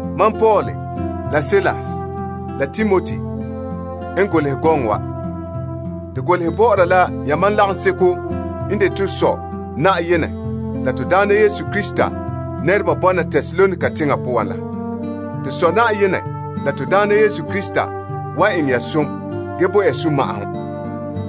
Mam Paul, la Silas, la Timoti n golehɛ gɔŋɔ wa. To golehɛ bɔ'ɔra la yamam lagaŋseko n de to Sɔ Yenɛ la Na'ayenɛ Yesu Krista nɛreba bɔna Tesalonika teŋa poan la. To Sɔ Yenɛ la Na'ayenɛ Yesu Krista wan eŋɛ ya som ge bo ya sunma'ahom.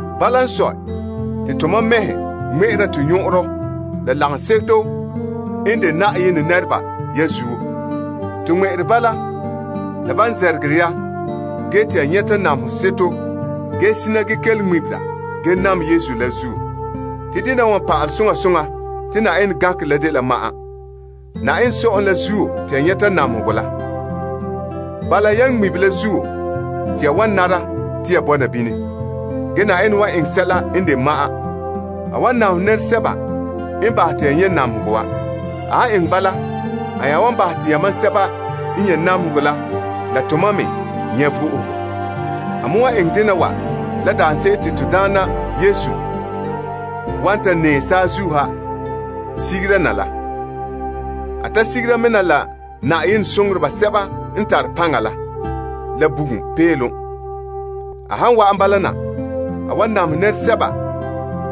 Bala n sɔe, te tomam mɛhe ŋmɛ'ɛra to nyɔn'ɔnrɔ la lagaŋseto n de Yenɛ nɛreba ya zuo. To ŋmɛ'ɛre bala la ban zɛrɛgɛ ya ge te ya nyɛta namehe seto ge zina ge kelom ŋmebera ge nam Yesu la zuo. Te dena wa n pa'alɛ soŋa soŋa te Yenɛ gankerɛ la dela ma'an. Yenɛ Sɔ'ɔlom la zuo te ya nyɛta namehegɔ la. Bala, yan ŋmibe la zuo te ya wan nara te ya bɔna bini. Ge Yenɛ wan eŋɛ sɛla n de ma'an. A wan namehɛ nɛresɛba n bahɛ te ya nyɛ' namehegɔ wa. A wan bahɛ te yamam sɛba n nyɛ' namehegɔ la la tomam me nyɛ' vo'ohogo. A wan eŋɛ dena wa la daanse'ere daarɛ te Na'ayenɛ Yesu wan ta nɛɛ saazuo ha sigera na la. A ta sigera me na la Na'ayenɛ soŋoreba sɛba n tare paŋa la, la bugum peelom. A han wa'an bala na, a wan namehɛ nɛresɛba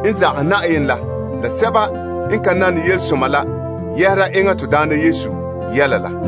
n zagahɛ Yenɛ la la sɛba n ka nane yelesoma la yɛhera enŋa to Na'ayenɛ Yesu yɛla la.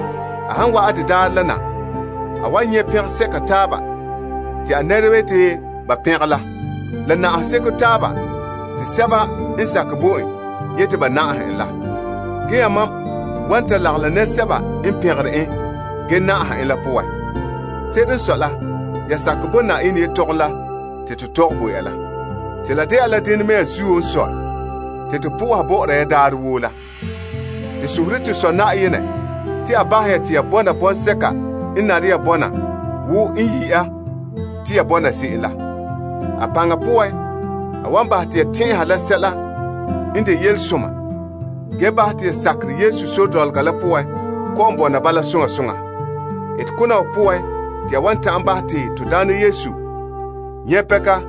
A han wa'an de daarɛ na, a wan to'e pɛnka la na'ahegɔ sɛba n sakɛ bo en zen'en. Yamam me wan lagom la nɛresɛba n pɛngere en ge na'aha en la poan. Se'ere n sɔe la, ya sakɛ bo yetɔgom la te to tɔgɛ bo ya la. Te la dena mea zuo n sɔe, te to po'oha bɔ'ɔra ya daarɛ woo la. To sohore to Sɔ Yenɛ te a bahɛ ya te ya bɔna enŋa n yi' ya na te ya bɔna se'em la. A paŋa poan, a wan bahɛ te ya tɛn'ɛha la sɛla n de yelesoma ge bahɛ te ya sakerɛ Yesu sore dɔlɔga la poan kɔ'ɔn bɔna bala soŋa soŋa. Etekona wa poan te ya wan ta'an bahɛ te to Na'ayenɛ Yesu nyɛ' pɛnka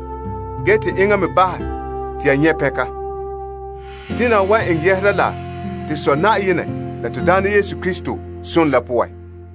ge te enŋa me bahɛ te ya nyɛ' pɛnka. Dena wa wan eŋɛ yɛhera la to Yenɛ la Na'ayenɛ Yesu Krista som la poan.